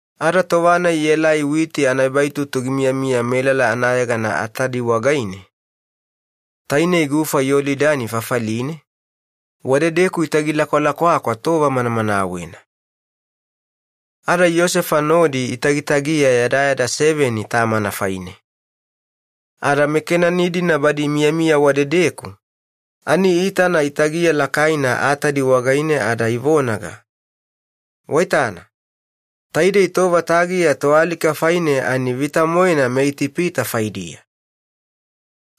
Ada tova-nai ielai Atadi yana witi anaebaitutu wagaine, tainei gufa Yolidani lilivane, wadedeku itagi lakwalakwakwa aku taudiyavo ibaibaidadanedi tova manamanawena. Ada wadedeku Yosefa nodi itagitagiya yadayada seveni tamana faine. Ada meKenani-dina badi imiyamiya wadedeku ani iitana fafali-nai wagaine tagiya lakaina, ada ivonaga, “Waitana, taidei tova tagiya toalika faine vita-moena meItipita faidiya.”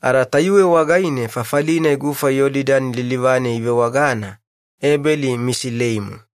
Ada tayuwe wagaine fafali-nai gufa Yolidani lilivane ivewagana Ebeli-Misilaimu.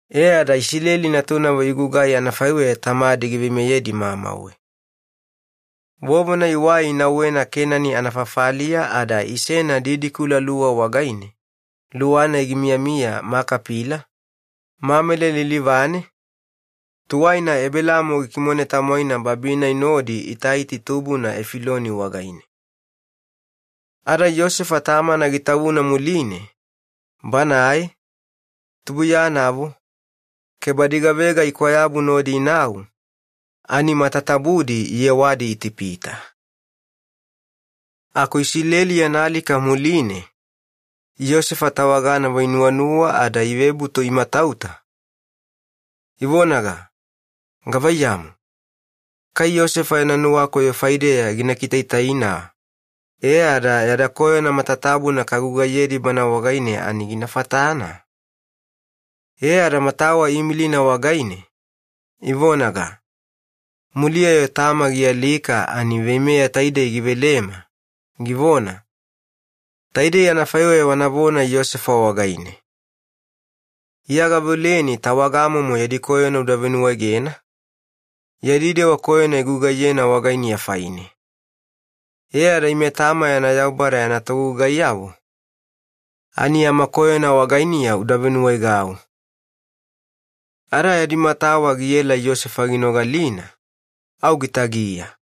E ada Iyakobo natunavo igugai anafaiweya tamadi giveimeyedi mamauwe. Vovona iwai inauwena Kenani anafafaliya ada isena luwa didikula wagaine, luwa-nai gimiyamiya Makapila, Mamele lilivane, tuwaina Ebelaamo gikimone tamwaina wababina nodi Itaiti tubuna Efiloni wagaine. Ada Yosefa tamana gitavuna muline banae, anatubulugayavo, ke badi gavega ikwayabu nodi inau ani matatabudi iyewadi Itipita. Yosefa tawaganavo giawaasevatudi. Iyakobo yana alika muline, Yosefa tawaganavo inuwanuwa ada ivebutu imatauta, ivonaga, “Gavaiyamu, kai Yosefa yana nuwakoyo gina kiveyabina ke aimo gina miwayaudi yada koyona matatabuna kagugaiyedi wagaine faidiya?” E ada matawa iimilina wagaine, ivonaga, “Muliya-yo tama gialika ani veimeya taidei givelema, givona, ‘Taidei anafaiweya wanavona Yosefa wagaine: Iya gaveoleni tawagamomo yadi koyona uda venuwaegedi, yadi dewa koyona igugaiyena wagainiya faine.' E ada ime, tama yana Yaubada yana togugaiyavo, ani yama koyona wagainiya uda venuwaegau.” Ada yadi matawa giela Yosefa ginogalina, au giafuwa gitagiya.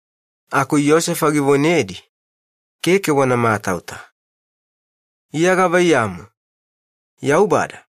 Aku Yosefa givonedi, “Keke wana matauta. Iya gavaiyamu, Yaubada?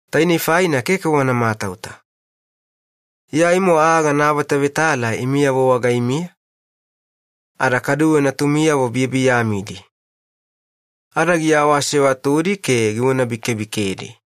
Tainei faina keke wana matauta. Aimo aa gana avetavetala imi faimiya ke natumiyavo biyabiyamidi faidiya.” Ada giawaasevatudi ke givonabikebikedi. Yosefa yana alika.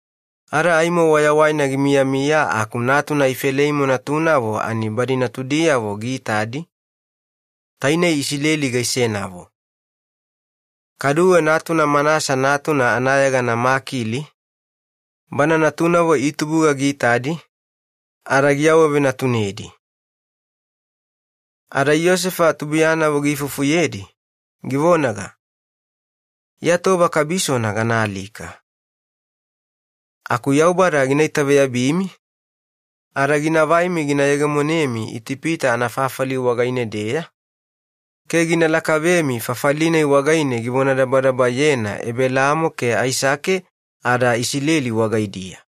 ada aimo wayawaina gimiyamiya aku Ifeleimu natunavo, natudiyavo tainei Iyakobo gaisenavo giitadi. Kaduwe natuna Manasa natuna anayegana Makili natunavo itubuga ani Yosefa giawavenatunedi. Ada Yosefa anatubulugayavo giifufuyedi, givonaga, “Iya tova kabisona ganaalika. Aku velemoena Yaubada gina lememi, ada ginavaimi gina yegemonemi fafali taidei wagaine-deya ke gina lakavemi fafali-nai wagaine givonadabadabayena Ebelaamo ke Aisake ada Iyakobo wagaidiya.”